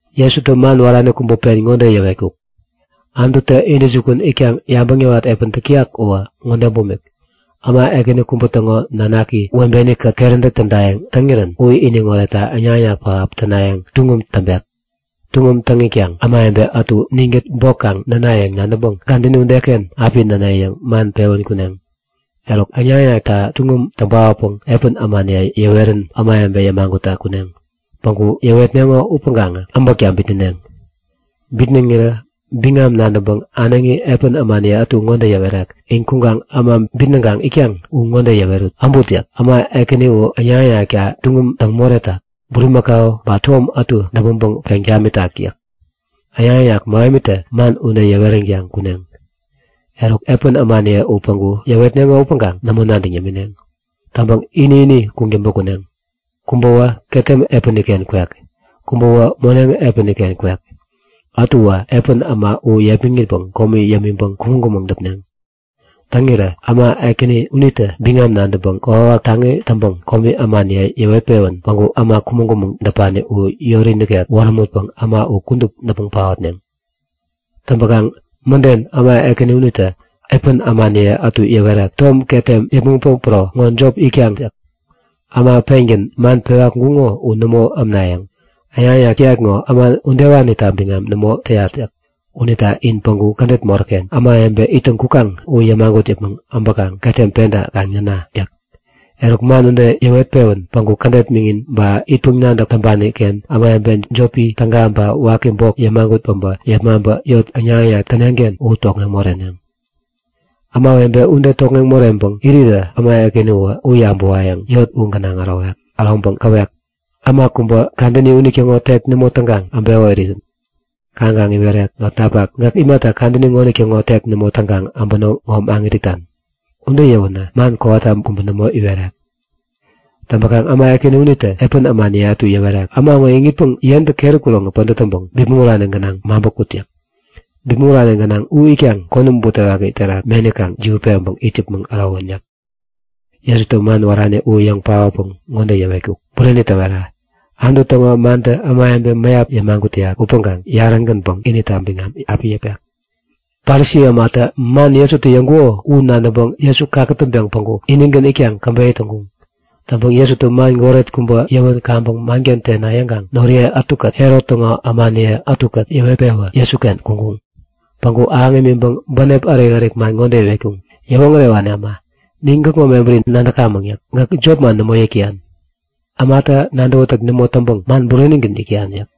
Jesutä man wärani kubä pen ŋode yäwetkuk; Anututä intäjukun itkaŋ yabäŋ yäwat epän täk täyak uwä ŋode bumik; Äma ekäni kubä täŋo nanaki webeni-kät keräntäk tädayäŋ täŋirän u iniŋ oretta äŋnak-äŋnak pähap täŋpayäŋ tuŋum täŋpek. Tuŋum täŋ itkaŋ ämawebe ätu ninkät bok kaŋ nänayäŋ nadäŋpäŋ kadäni udeken api näne yäŋ man pewän kuneŋ. Eruk, äŋnak-äŋnakta tuŋum täŋ paotpäŋ epän ämaniye yäwerän ämawebe yämagutta kuneŋ. Päŋku yäwetneŋo upäŋkaŋä äbäkta bitnäneŋ. Bitnäŋirä biŋami nadäŋpäŋ äneŋi epän ämaniye ätu ŋode yäwerek; In kuŋkaŋ äma bitnäŋkaŋ itkaŋ u ŋode yäwerut; Äbut! yäk. Äma ekäni u äŋnak-äŋnakta tuŋum täŋ moretak. Bulimäkau ba tom ätu däpmäŋpäŋ peŋ tamitak yäk. Äŋnak-äŋnak mähemitä man ude yäweränkaŋ kuneŋ. Eruk epän ämaniye u päŋku yäwetneŋo upäŋkaŋ nämo nadäŋ yämineŋ. Täŋpäŋ ini-ini kuŋtäŋpä kuneŋ. Kubäwä ketem epäni-ken kwek. Kubäwä moneŋ epäni-ken kwek. Ätuwä epän äma u yepmäŋitpäŋ komi yämiŋpäŋ kumäŋ-kumäŋ däpneŋ. Täŋirä äma ekäni unitä biŋam nadäŋpäŋ kokwawak taŋi täŋpäŋ komi ämaniye yäwet-pewän päŋku äma kumäŋ-kumäŋ däpani u yori nikek wärämutpäŋ äma u kudup däpmäŋ paotneŋ. Täŋpäkaŋ mäden äma ekäni unitä epän ämaniye ätu yäwerek; Tom ketem yäpmäŋpäŋ pero ŋo jop itkaŋ yäk. Äma pengän man pewa kuŋkuŋo u nämo ämnayäŋ. Äŋnak-äŋnak täyat ŋo äma udewanita biŋam nämo täyat yäk. Unita in päŋku kädet moräk-ken ämawebe ittäŋ kukaŋ u yämagut yäpmäŋ äbäkaŋ ketem penta kaŋ näna! yäk. Eruk man ude yäwet-pewän päŋku kädet miŋin ba itpäŋ-nadäk täŋpani-ken ämawebe jopi täga ba waki bok yämagut päbä yepmaŋpä yot äŋnak-äŋnak täneŋ-ken u tokŋeŋ moreneŋ. Ämawebe ude tokŋeŋ moreŋpäŋ irirä äma ekäni uwä u yabäwayäŋ yot u gänaŋ äroŋpäŋ käwek; Äma kubä kadäni unitäŋo tek nämo täŋkaŋ äbeko irirän. Kaŋkaŋ iwerek; Notnapak! Gäk imata kadäni ŋonitäŋo tek nämo täŋkaŋ äbäno ŋo maŋit itan? Ude yäwänä man kowata kubä nämo iwerek. Täŋpänkaŋ äma ekäni unitä epän ämaniye ätu yäwerek; Äma ŋo iŋitpäŋ yentä keri kuroŋi pädät täŋpäŋ bipmäŋ urani gänaŋ maŋpä kut! yäk. Bipmäŋ urani gänaŋ u itkaŋ konäm butewaki terak meni kaŋ jiwätpeŋ it yäpmäŋ ärowän yäk. Jesutä man wärani u yäŋ paotpäŋ ŋode yäwetkuk; Bureni täwera. Anutu täŋo mantä ämawebe mäyap yämagut täyak upäŋkaŋ yarä-gänpäŋ inita biŋam api yäpek. Parisi ämatä man Jesutä yäŋkuko u nadäŋpäŋ Jesu kakätäŋpeŋ päŋku inigän itkaŋ käbeyä täŋkuŋ. Täŋpäŋ Jesutä man goret kubä yäwän kaŋpäŋ manken tena yäŋkaŋ noriye ätukät Herot täŋo ämaniye ätukät yäwet-pewä Jesuken kuŋkuŋ. Päŋku ahäŋ imiŋpäŋ bänep ärik-ärik man ŋode iwetkuŋ; Yäwoŋärewani äma, nin gäkŋo mebäri nadäkamäŋ yäk. Gäk jopman nämo yäk täyan. Ämata nadäwätäk nämo täŋpäŋ man burenigän yäk täyan yäk.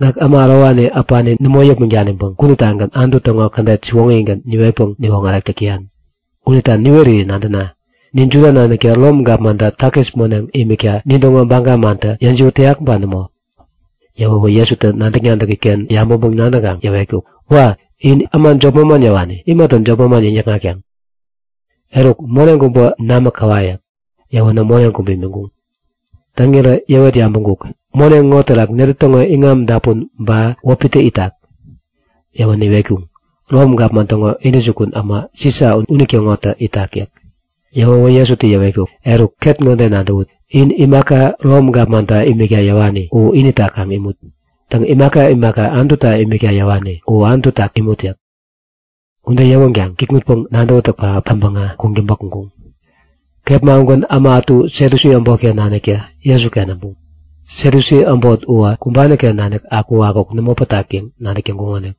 Gäk äma ärowani äpani nämo yäpmäŋ daniŋpäŋ kuduptagän Anutu täŋo kädet siwoŋigän niwetpäŋ niwoŋärek täk täyan. Unita niweri nadäna; Nin Juda naniktä Rom gapmanta takis moneŋ imikta nintäŋo baga mantä yäjiwät täyak ba nämo? Yäwäwä Jesutä nadäk-nadäki-ken yabäŋpäŋ-nadäŋkaŋ yäwetkuk; Wa! In äma jop manman yäwani. Imata jopman yäŋnäkŋatkaŋ? Eruk, moneŋ kubä namä käwa yäk. Yäwänä moneŋ kubä imiŋkuŋ. Täŋirä yäwet yabäŋkuk; Moneŋ ŋo terak netä täŋo iŋami dapun ba wäpitä itak? Yäwänä iwetkuŋ; Rom gapman täŋo intäjukun äma Sisa unitäŋotä itak yäk. Yäwäwä Jesutä yäwetkuk; Eruk ket ŋode nadäwut; In imaka Rom gapmanta imikta yäwani u inita kaŋ imut. Täŋ, imaka imaka Anututa imikta yäwani u Anututa kaŋ imut yäk. Ude yäwänkaŋ kikŋutpäŋ nadäwätäk täŋpäŋä kuŋtäŋpä kuŋkuŋ. Kepma ugän äma ätu Satyusi äbotken naniktä Jesuken äbuŋ. (Satyusi äma uwä kumbani-ken nanik akukakuk nämo pätak yäŋ nadäk täŋkuŋonik.)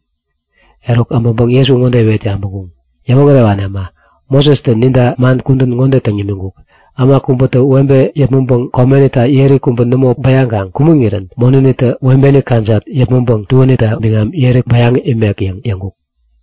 Eruk abäŋpäŋ Jesu ŋode iwet yabäŋkuŋ; Yäwoŋärewani äma, Mosestä ninta man kudän ŋode täŋ nimiŋkuk; Äma kubätä webe yäpmäŋpäŋ komenita yeri kubä nämo bäyaŋkaŋ kumäŋirän monänitä webeni kajat yäpmäŋpäŋ tuänita biŋam yeri bäyaŋ imek yäŋ yäŋkuk.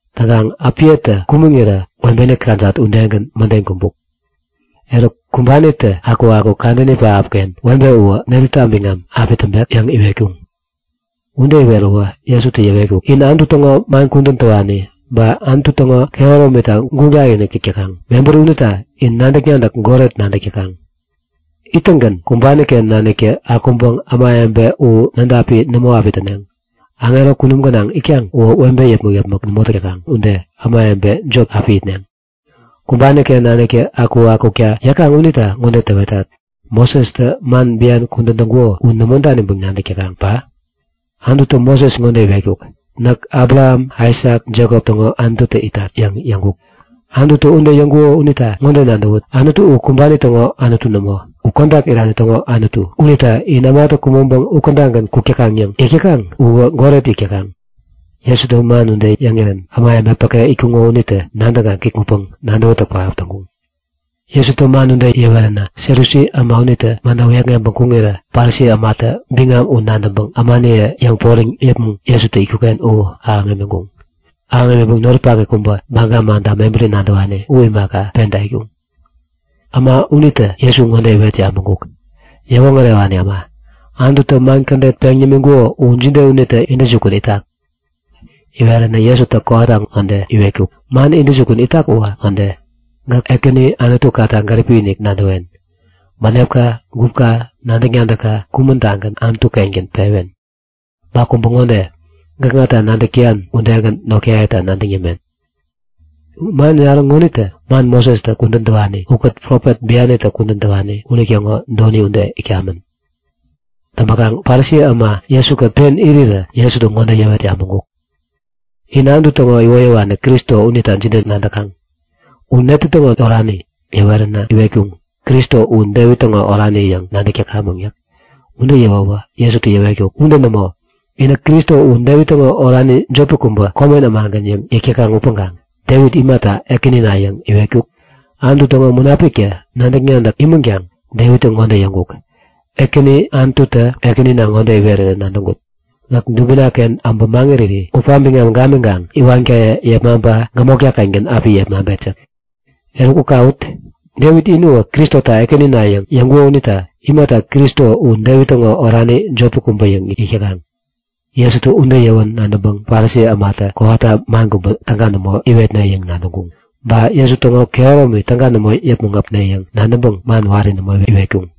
Täŋkaŋ äpiyetä kumäŋirä webeni kajat udegän mäden kumbuk. Eruk, kumbanitä akukakuk kadäni webe uwä netäta biŋam api täŋpek? yäŋ iwetkuŋ. Ude iweräwä Jesutä yäwetkuk; In Anutu täŋo man kudän täwani ba Anutu täŋo kehäromita guŋ takinik täk täkaŋ. Mebäri unita in nadäk-nadäk goret nadäkaŋ! Ittäŋgän kumbani-ken naniktä akuŋpäŋ ämawebe u nädapi nämo api täneŋ. Aŋero kunum gänaŋ itkaŋ uwä webe yäpmäk-yäpmäk nämo täk täkaŋ ude ämawebe jop api itneŋ. Kumbani-ken naniktä akukakukta yäkaŋ unita ŋode täwetat; Mosestä man bian kudän täŋkuko u nämo daniŋpäŋ nadäk täkaŋ ba? Anututä Moses ŋode iwetkuk; Näk Abraham, Aisak, Jekop täŋo Anututä itat yäŋ yäŋkuk. Anututä ude iwetkuko unita ŋode nadäwut; Anutu u kumbani täŋo Anutu nämo. Uwä kodak irani täŋo Anutu. Unita inä ämatä kumäŋpeŋ u kädagän kuk täkaŋ yäŋ yäk täkaŋ uwä goret-inik yäk täkaŋ. Jesutä man ude yäŋirän ämawebe päke itkuŋo unitä nadäŋkaŋ kikŋutpäŋ nadäwätäk pähap täŋkuŋ. Jesutä man ude yäweränä Satyusi äma unitä manta wäyäkŋeŋpäŋ kuŋirä Parisi ämatä biŋam u nadäŋpäŋ ämaniye yäŋporiŋ yäpmäŋ Jesutä itkuk-ken u ahäŋ imiŋkuŋ. Ahäŋ imiŋpäŋ noripak kubä, Baga manta mebäri nadäwani u imaka, penta itkuŋ. Äma unitä Jesu ŋode iwet yabäŋkuk; Yäwoŋärewani äma, Anututä man kädet peŋ nimiŋkuko u jide unitä intäjukun itak? Iweränä Jesutä kowata ŋode iwetkuk; Man intäjukun itak uwä ŋode; Gäk Ekäni Anutukata gäripi-inik nadäwen. Bänepka, gupka, nadäk-nadäkka kumän-tagän Anutu-kengän pewen. Ba kubä ŋode; Gäkŋata nadäk täyan udegän notkayeta nadäŋ yämen. Man yarä ŋonitä man Mosestä kudän täwani ukät profet bianitä kudän täwani unitäŋo doni ude itkamän. Täŋpäkaŋ Parisi äma Jesu-kät pen irirä Jesutä ŋode yäwet yabäŋkuk; In Anutu täŋo iwoyäwani Kristo unita jide nadäkaŋ? U netä täŋo orani? Yäweränä iwetkuŋ; Kristo u Devit täŋo orani yäŋ nadäk täkamäŋ yäk. Ude yäwäwä Jesutä yäwetkuk; Ude nämo. Inä Kristo u Devit täŋo orani jopi kubä, komen ämagän yäŋ yäk täkaŋ upäŋkaŋ Devit imata Ekänina yäŋ iwetkuk? Anutu täŋo Munapiktä nadäk-nadäk imänkaŋ Devittä ŋode yäŋkuk; Ekäni Anututä Ekänina ŋode iwerirän nadäŋkut; Gäk dubina-ken äbä maŋiriri wäpka biŋam gamiŋkaŋ iwankaye yäpmäŋpäŋ gämotka-kengän api yepmaŋpet yäk. Eruk u kawut! Devit ini uwä Kristota Ekänina yäŋ yäŋkuko unita imata Kristo u Devit täŋo orani jopi kubä yäŋ yäk täkaŋ? Jesutä ude yäwän nadäŋpäŋ Parisi ämatä kowata man kubä täga nämo iwetne yäŋ nadäŋkuŋ. Ba Jesu täŋo kehäromi täga nämo yäpmäŋ äpne yäŋ nadäŋpäŋ man wari nämo iwetkuŋ.